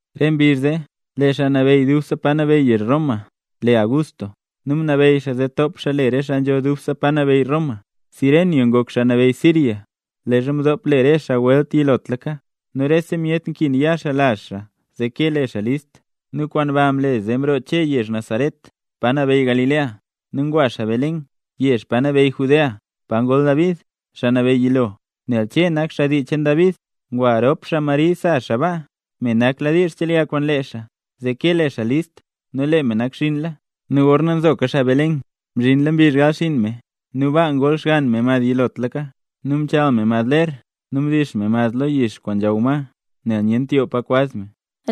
Re mbizh zee lee xaa nabeyy dubse pa nabeyy yezh Roma le Augusto, nu mnabeyy xaa zee top xaa le re xaa nzho dubse pa nabeyy Roma. Cirenio ngok xaa nabeyy Siria leezha mdop le re xaa welt yilotlaka. Nu rese myet nkin ya xaa lazh xaa zee kee le xaa list. Nu kwaan ba mle zee mroo Che yezh Nazaret, pa nabeyy Galilea, nu ngwa xaa Belén, yezh pa nabeyy Judea, pa ngol David, xaa nabeyy yilo, nel Che nak xaa dii cheen David. Ngwa rop xaa Mari sa xaa baa, me nakladiizh chelya kwaan lee xaa, zee ke le xaa list; nu lee me nakxiinla. Nu gorna nzoka xaa Belén, mzhinla mbizh gal xinn me. Nu baa ngol xgann me mad yilotlaka, nu mchal me mad ler nu mdix me mad lo yix kwaan nzhaw ma, nel nyent yoo pa kwaz me.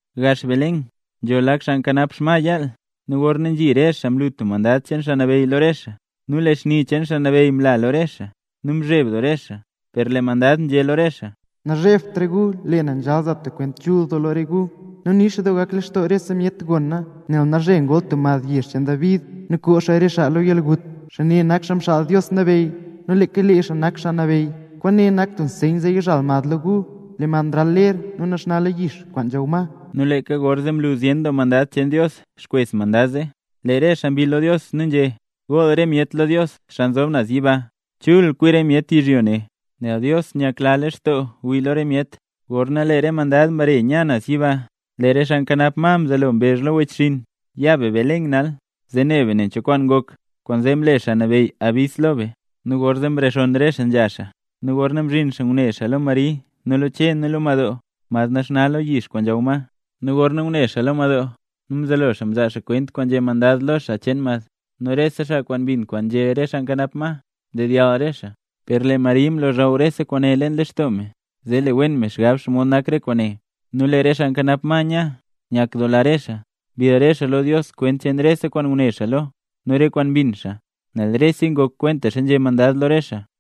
Gax Belén nzho lak xaa nkanap xma nzhal yaal. Nu gorna nzhi re xaa mlu tub mandad cheen Xaa Nabeyy lo re xaa, nu lee xni cheen Xaa Nabeyy mla lo re xaa; nu mzheb doo re xaa. Per lee mandad nzhé lo re xaa: —Nazhebt re gu, nel lee na nzhal za tub kwent chul doo lo re gu, nu nix doo gak lextoo rese myet gona. Nel nalzhe ngol tub mad yezh cheen David nu koo xaa re gu lo yalgut. Xaa ne nak Xaa Mxaal Dios Nabeyy, nu leeka lee xaa nak Xaa Nabeyy. Kwaane nak tub nseyn zee yizhal mad lo gu, lee mad nral ler nu naxna lo yix kwaan nzhaw ma. Nu leeka gorzee mlu zyen doo mandad cheen Dios xkwes mandad zee, lee re xaa mbill lo Dios nu nzhé: ¡Gool re myet lo Dios xaa nzob naz yiba! ¡Chul kwi re myet yizhyo ne, nel Dios nyakla lextoo wii lo re myet! Gorna lee re mandad mbare nya naz yiba, lee re xaa nkanap ma mzelo mbezh lo re wechxinn: —Ya be Belén nal, zee ne be nen cho kwaan ngok, kwaanzee mle Xaa Nabeyy yabis lo be. Nu gorzee mrexonn re xaa nzha xaa, nu gorna mzhin xaa ngune xaa lo Mari nu lo Che nu lo madoo, mad naxna lo yix kwaan nzhaw ma. Nu gorna ngune xaa lo madoo, nu mzelo xaa mzaa xaa kwent kwaan nzhé mandad lo xaa cheen mad, nu rese xaa kwaan mbin kwaan nzhé re xaa nkanap ma, mdedyall re xaa. Per lee Mari mlozhaw rese kwaane leen lextoo me, zee le wen me xgab xomod nak re kwaane. Nu lee re xaa nkanap ma nya, nyakdoola re xaa. Mbill re xaa lo Dios kwent cheen rese kwaan ngune xaa lo, nu re kwaan mbin xaa, nel reseya ngok kwentaxa nzhé mandad lo re xaa.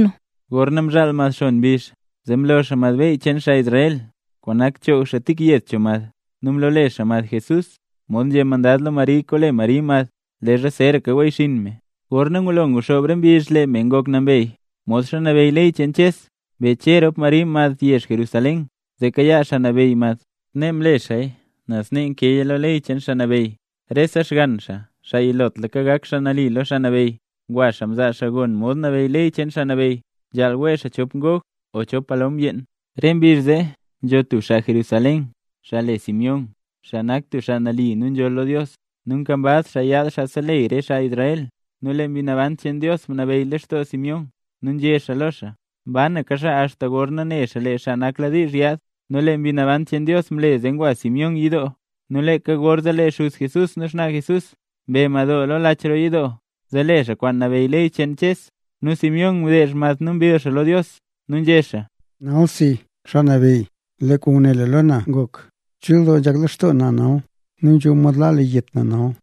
Gorna mzhaal mad xon mbizh, zee mlo xaa mad beyy cheen xaa Israel kwaan nak mchoog xaa tik yed cho mad, nu mlole xaa mad Jesús, mod nzhé mandad lo Mari kole Mari mad leezha zeeraka weyyxiin me. Gorna ngulo nguxoob re mbizh lee me ngok nambey, modxa nabeyy ley cheen Ches, mbe Che rop Mari mad yezh Jerusalén, zee kayaa Xaa Nabeyy mad. Snee mle xaaya nel snee nkeeya lo ley cheen Xaa Nabeyy: “Rese xgann xaa, xaa yilotlaka, gak xaa nali lo Xaa Nabeyy”. Ngwa xaa mzaa xaa gon mod nabeyy ley cheen Xaa Nabeyy, nzhaal wee xaa chop ngog o chop palom yeen. Re mbizh zee nzho tub xaa Jerusalén, xaa le Simeón, xaa nak tub xaa nali nu nzholl lo Dios nu nkambaz xaa yaad xaa seleyy re xaa Israel. Nu lee Mbi Naban cheen Dios mnabeyy lextoo Simeón, nu nzhé xaa lo xaa, mbanaka xaa axta gorna ne xaa lee Xaa Nakladiizh Yaad. Nu lee Mbi Naban cheen Dios mle zee ngwa Simeón yidoo; nu leeka gorzee lee xuz Jesús nu xnaa Jesús mbe madoo lo lach roo yidoo, zee le xaa kwaan nabeyy ley cheen Ches. Nu Simeón mdeezh mad nu mbill xaa lo Dios, nu nzhé xaa: Nalsi, Xaa Nabeyy, lee kwaan nguné lu lo na ngok; chul doo nzhak lextoo na nal nu nzho mod laa lu yet na nal.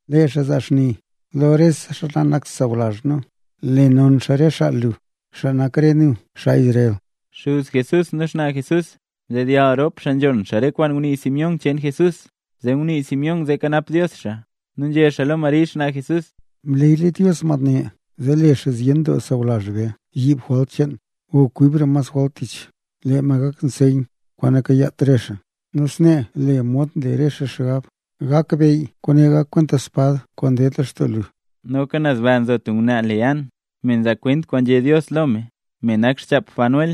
Lee xaa zaa xni lo rese xaa nanakt xaa sawlazh nu, nu le non xaa re xaa lu, xaa nak re nu, xaa Israel. Xuz Jesús nu xnaa Jesús mdedyall rop xaa nzhon xaa re kwaan ngunii Simeón cheen Jesús. Zee ngunii Simeón zee kanap Dios xaa, nu nzhé xaa lo Mari xnaa Jesús: —Lee mad ne mleeyla Dios, zee le xaa zyen doo sawlazh be yiib jwalt cheen o kwibra mas jwalt tich. Lee mad gak tub nseyn kwaan nakayaat re xaa, nu snee lee mod nle re xaa xgab gakbeyy. Per lee re kwaane gak kwenta tub spad kwaan ded lextoo lu. Noka naz ba nzo tub ngwnaa le An, me nzaa kwent kwaan nzhé Dios lo me, me nak xchap Fanuel,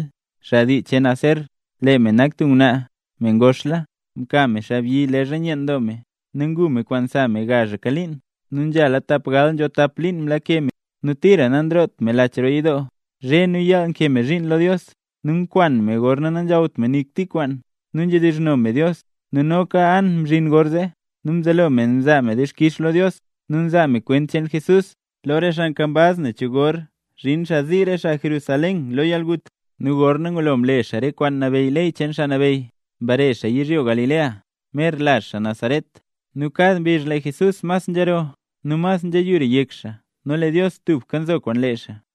xaa dii cheen Aser. Lee me nak tub ngwnaa, me ngoxla. Mka me xaabyi leezha nyeen doo me, nu ngu me kwaan sa me gazhaka liin; nu nzhala tapgal nzho tap liin mlake me byud. Nu tira nanroot me lach roo yidoo, zhe nu yaal nkee me zhiin lo Dios, nu nkwan me gorna nanzhawt me nik tik kwaan, nu nzhedizhno me Dios. Nu noka An mzhin gorzee, nu mzelo me mzaa me dixkix lo Dios, nu nzaa me kwent cheen Jesús, lo re xaa nkambaz nen cho gor zhin xaa zii re xaa Jerusalén lo yalgut. Nu gorna ngulo mle xaa re kwaan nabeyy ley cheen Xaa Nabeyy, mbare xaa yizhyo Galilea, mer lazh xaa Nazaret. Nu kad mbizh lee Jesús mas nzhero nu mas nzheyura yek, nu lee Dios tubka nzo kwaan lee xaa.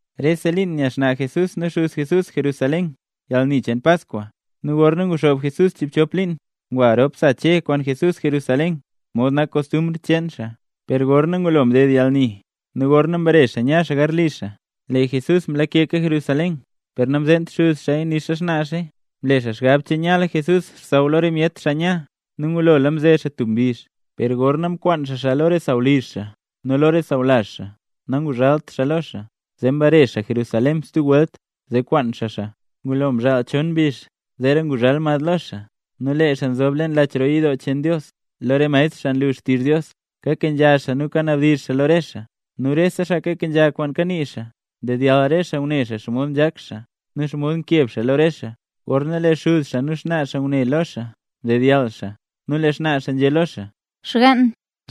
Rese liin nya xnaa Jesús nu xuz Jesús Jerusalén yalni cheen Paskwa. Nu gorna nguxoob Jesús chiibchop liin, ngwa rop sa Che kwaan Jesús Jerusalén, mod nak kostumbr cheen xaa. Per gorna ngulo mded yalni, nu gorna mbare xaa nya xaa garli xaa, lee Jesús mlakeka Jerusalén, per namzeent xuz xaaya nixa xnaa xaa. Mle xaa xgab che nyala Jesús xsaww lo re myet xaa nya, nu ngulola mze xaa tub mbizh; per gorna mkwaan xaa xaa lo re sawlizh xaa nu lo re sawlazh xaa nanguzhalt xaa lo xaa. Zee mbare xaa Jerusalén stub welt, zee kwaan xaa xaa. Ngulo mzhaal chon mbizh zeera nguzhal xaa lo xaa. Nu lee xaa nzob leen lach roo yidoo cheen Dios, lo re maestr xaa nlu xtizh Dios, kakenzha xaa nu kanabdizh xaa lo re xaa. Nu rese xaa kakenzha kwaan kanii xaa, ndedyall re xaa ngune xaa xomod nzhak xaa, nu xomod nkeb xaa lo re xaa. Gorna lee xuz xaa nu xnaa xaa ngune lo xaa mdedyall xaa; nu lee xnaa xaa nzhé lo xaa: —Xgann,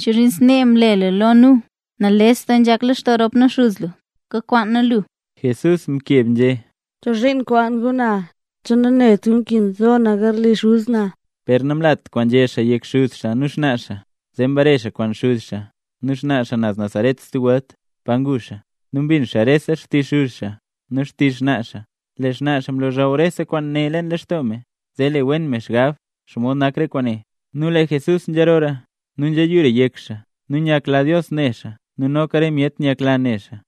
¿chozhiin snee mle lu lo nu? Nales doo nzhak lextoo rop nu xuz lu, kakwaan nu lu. Jesús mkeb nzhé: —¿Chozhiin nkwaan gu na? ¿Che nanet gu nkin zo na garli Xuz na? Per namlat kwaan nzhé xaa yek xuz xaa nu xnaa xaa. Zee mbare xaa kwaan xuz xaa nu xnaa xaa naz Nazaret stub welt, pa ngu xaa. Nu mbin xaa rese xtizh xuz xaa nu xtizh xnaa xaa. Lee xnaa xaa mlozhaw rese kwaane leen lextoo me, zee le wen wen me xgab xomod nak re kwaane. Nu lee Jesús nzharoora, nu nzhiyura yek xaa, nu nyakla Dios ne xaa nu noka re myet nyakla ne xaa.